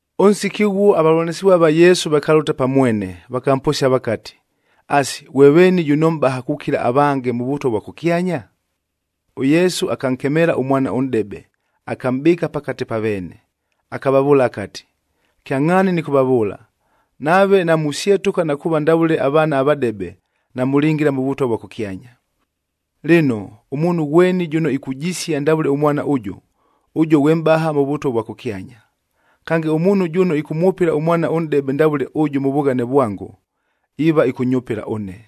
Ʉnsiki ʉghuo avavʉlanɨsɨvua va Yesu vakalʉta pa mwene, vakamposia vakati, “Asi, ghwe veeni jʉno mʼbaha kukila avange mʉ Vʉtwa vwa kʉkyanya?” ɄYesu akankemeela ʉmwana ʉnʼdebe, akamʼbɨɨka pakate pa veene, akavavʉʉla akati, “Kyangʼhaani nɨkʉvavʉʉla, nave namusyetʉka na kuuva ndavʉle avaana avadebe, namʉlingila mʉ Vʉtwa vwa kʉkyanya. Lɨno, ʉmuunhu ghweni jʉno ikujisia ndavʉle ʉmwana ʉjʉ, ʉjuo ghwe mʼbaha mʉ Vʉtwa vwa kʉkyanya. Kange, ʉmuunhu jʉno ɨkʉmwʉpɨla ʉmwana ʉnʼdebe ndavʉle ʉjʉ mʉ vughane vwango, iiva ɨkʉnyʉpɨla ʉne.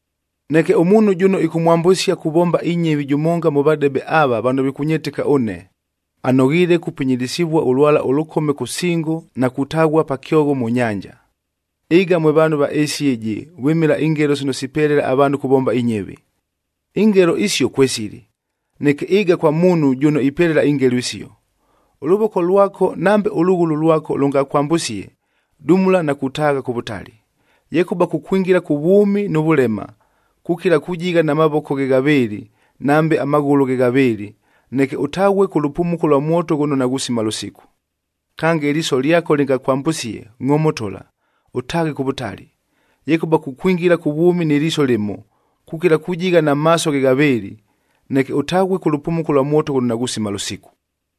“Neke ʉmuunhu jʉno ɨkʉmwambʉsia kuvomba inyɨvi jʉmonga mʉ vadebe ava vano vikʉnyɨtɨka ʉne, anoghiile kupinyilisivua ʉlwala ʉlʉkome kʉ singo na kutaghua pa kyogho mʉ nyanja. Ɨga mwe vaanhu va ɨɨsi ɨjɨ vwɨmɨla ingelo sino sipelela avaanhu kuvomba inyɨvi! Ingelo isio kwesili, neke ɨga kwa muunhu jʉno ipelela ingelo isio! Ʉlʉvoko lwako, nambe ʉlʉghʉlʉ lwako lʉngakwambʉsie, dumula na kutaagha kʉ vʉtali. Yekʉba kukwingila kʉ vwʉmi nʉ vʉlema, kukila kujigha na mavoko ghe ghavɨɨlɨ nambe amaghʉlʉ ghe ghavɨɨlɨ, neke ʉtaghue kʉ lʉpumuko lwa mwoto ghʉno naghusima lʉsiku. Kange, ɨliiso lyako lɨngakwambʉsie ngʼomotola, ʉtaaghe kʉ vʉtali. Yekʉba kukwingila kʉ vwʉmi nɨ liiso lɨmo, kukila kujigha na maaso ghe ghavɨɨlɨ, neke ʉtaghue kʉ lʉpumuko lwa mwoto ghʉno naghusima lʉsiku.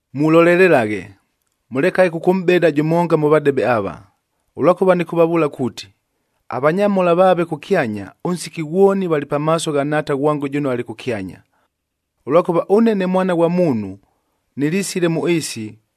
“Mulolelelaghe, mʉlekaghe kʉkʉmʼbeda jʉmonga mʉ vadebe ava, ʉlwakʉva nɨkʉvavʉʉla kuuti, avanyamhola vaave kʉkyanya, ʉnsiki ghwoni valɨ pamaaso gha Nhaata ghwango jʉno alɨ kʉkyanya. Ʉlwakʉva ʉne ne Mwana ghwa Muunhu nɨlisile mʉ ɨɨsi,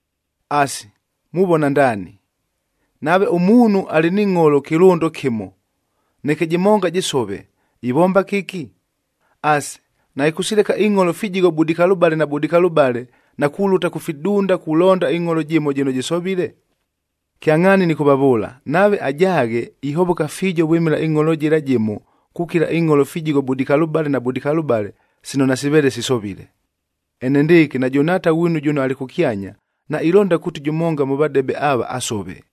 Asi, muvona ndaani? Nave ʉmuunhu alɨ ni ngʼholo kɨlʉndo kɨmo, neke jɨmonga jɨsove, ivomba kɨki? Asi, naɨkʉsileka ingʼholo fijigho budikalʉbale na budikalʉbale na kulʉta kʉ fidunda kulonda ɨngʼholo jɨmo jɨno jɨsovile? Kyangʼhaani nɨkʉvavʉʉla, nave ajaaghe, ihovoka fiijo vwɨmɨla ɨngʼholo jɨla jɨmo kukila ingʼholo fijigho budikalʉbale na budikalʉbale sino nasivele sisovile. Enendɨɨkɨ, najʉ Nhaata ghwinu jʉno alɨ kʉkyanya, nailonda kuuti jʉmonga mʉ vadebe ava asove.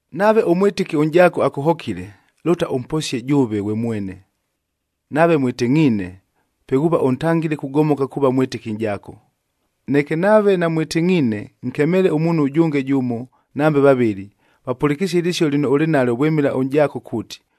“Nave ʉmwɨtɨki ʉnʼjaako akʉhokile, lʉta ʉmposie jʉʉve ghwe mwene. Nave mwɨtɨngʼhiine, pe ghuuva ʉntangile kugomoka kuuva mwɨtɨki nʼjaako. Neke nave namwɨtɨngʼhiine, nkemeele ʉmuunhu ʉjʉnge jʉmo nambe vavɨlɨ, vapʉlɨkɨsie ɨlɨsio lɨno ʉlɨ nalyo vwɨmɨla ʉnʼjaako kuuti,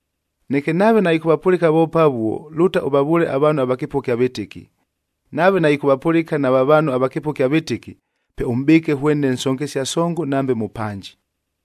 Neke nave naɨkʉvapʉlɨka voope avuo, lʉta ʉvavʉʉle avaanhu ava kɨpʉgha ɨkya vɨtɨki. Nave naɨkʉvapʉlɨka nava vaanhu ava kɨpʉgha ɨkya vɨtɨki, pe ʉmʼbɨɨke hwene nsongesia songo nambe mʉpanji.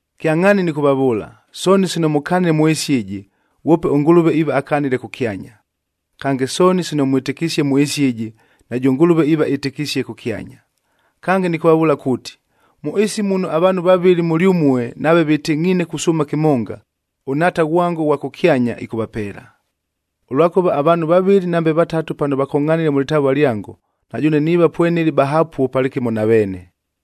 “Kyangʼhaani nɨkʉvavʉʉla, sooni sino mʉkanile mʉ ɨɨsi ɨjɨ, ghwope ʉNgʉlʉve iiva akanile kʉkyanya. Kange, sooni sino mwɨtɨkisie mʉ ɨɨsi ɨjɨ, najʉ Ngʉlʉve iiva ɨtɨkisie kʉkyanya. Kange, nɨkʉvavʉʉla kuuti, mʉ ɨɨsi muno avaanhu vavɨlɨ mʉlyʉmue nave vɨtɨngʼhiine kusʉʉma kɨmonga, ʉNhaata ghwango ʉghwa kʉkyanya, ɨkʉvapeela. Ʉlwakʉva avaanhu vavɨlɨ nambe vatatu pano vakongʼhanile mʉ lɨtavua lyango, na jʉʉne niiva pwenɨlɨ bahapuo palɨkɨmo na veene.”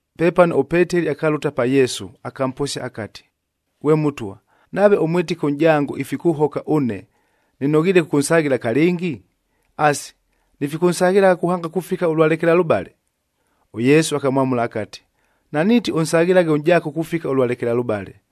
Pepano ʉPeteli akalʉta pa Yesu, akamposia akati, “Ghwe Mʉtwa, nave ʉmwɨtɨki ʉnʼjango ifikʉhoka ʉne, nɨnoghiile kʉkʉnsaghɨla kalɨngi? Asi, nifikʉnsaghɨlagha kuhanga kufika ʉlwa lekelalʉbale?” ɄYesu akamwamʉla akati, “Naniiti ʉnsaghɨlaghe ʉnʼjaako kufika ʉlwa lekelalʉbale,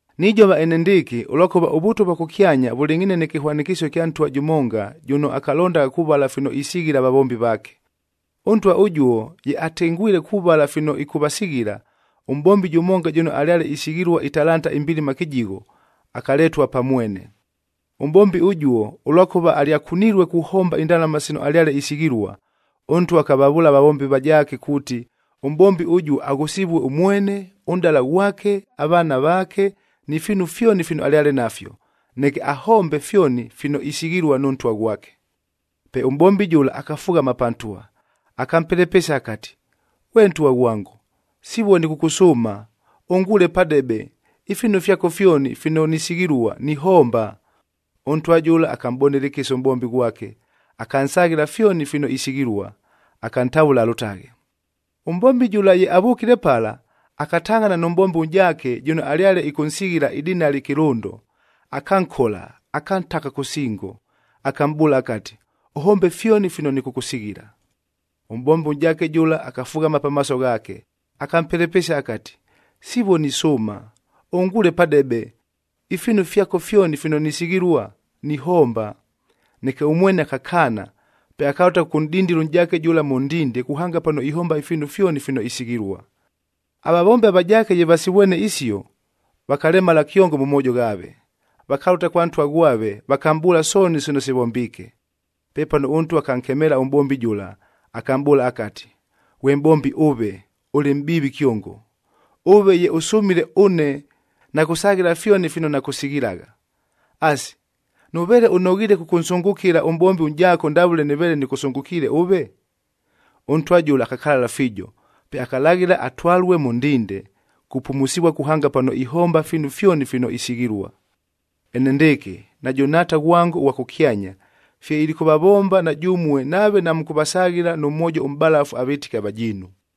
“Nijova enendɨɨkɨ, ʉlwakʉva ʉVʉtwa vwa kʉkyanya vʉlɨngʼhiine nɨ kɨhwanɨkɨsio ɨkya ntwa jʉmonga jʉno akalondagha kuvala fino isighila avavombi vaake. Ʉntwa ʉjuo ye atengwile kuvala fino ɨkʉvasighila, ʉmʼbombi jʉmonga jʉno alyale isighilua italanta imbilima kɨjigho,d akaletua pa mwene. Ʉmʼbombi ʉjuo, ʉlwakʉva alyakunilue kuhomba indalama sino alyale isighilua, ʉntwa akavavʉʉla avavombi avajaake kuuti, ʉmʼbombi ʉjuo aghʉsɨvue ʉmwene, ʉnʼdala ghwake, avaana vaake ni fiinu fyoni fino alyale nafyo, neke ahombe fyoni fino isighilua nʉ ntwa ghwake. “Pe ʉmʼbombi jʉla akafughama pa ntwa, akampelepesia akati, ‘Ghwe ntwa ghwango, sivuo nɨkʉkʉsʉʉma, ʉnguule padebe, ifiinu fyako fyoni fino nisighilua, nihomba.’ Ʉntwa jʉla akamʼbonela ɨkɨsa ʉmʼbombi ghwake, akansaghɨla fyoni fino isighilua, akantavʉla alʉtaghe. “Ʉmʼbombi jʉla ye avʉkile pala, akatangʼhana nʉ mʼbombi ʉnʼjaake jʉno alyale ɨkʉnsighila idinali kɨlʉndo,e akankola, akantaka kʉ singo, akamʼbʉʉla akati, ‘Ʉhombe fyoni fino nɨkʉkʉsighila.’ Ʉmʼbombi ʉnʼjaake jʉla akafughama pamaaso ghaake, akampelepesia akati, ‘Sivuo nisʉʉma ʉnguule padebe, ifiinu fyako fyoni fino nisighilua, nihomba.’ Neke ʉmwene akakaana, pe akalʉta kʉkʉnʼdindila ʉnʼjaake jʉla mʉ ndinde kuhanga pano ihomba ifiinu fyoni fino isighilua. “Avavombi avajaake ye vasivwene isio, vakalemala kyongo mʉ moojo ghaave, vakalʉta kwa ntwa ghwave vakamʼbʉʉla sooni sino sivombiike. Pepano ʉntwa akankemeela ʉmʼbombi jʉla, akamʼbʉʉla akati, ‘Ghwe mʼbombi ʉve, ʉlɨ mʼbiivi kyongo! Ʉve ye ʉsʉmile ʉne, nakʉsaghɨla fyoni fino nakʉsighilagha! Asi, nʉveele ʉnoghiile kʉkʉnsʉngʉkɨla ʉmʼbombi ʉnʼjaako ndavʉle nɨveele nɨkʉsʉngʉkiile ʉve?’ “Ʉntwa jʉla akakalala fiijo, pe akalaghɨla atwalue mʉ ndinde, kupumusivua kuhanga pano ihomba ifiinu fyoni fino isighilua. “Enendɨɨkɨ, najʉ Nhaata ghwango ʉghwa kʉkyanya fye ilikʉvavomba na jʉmue nave namʉkʉvasaghɨla nʉ mwojo ʉmʼbalafu avɨtɨki avajiinu.”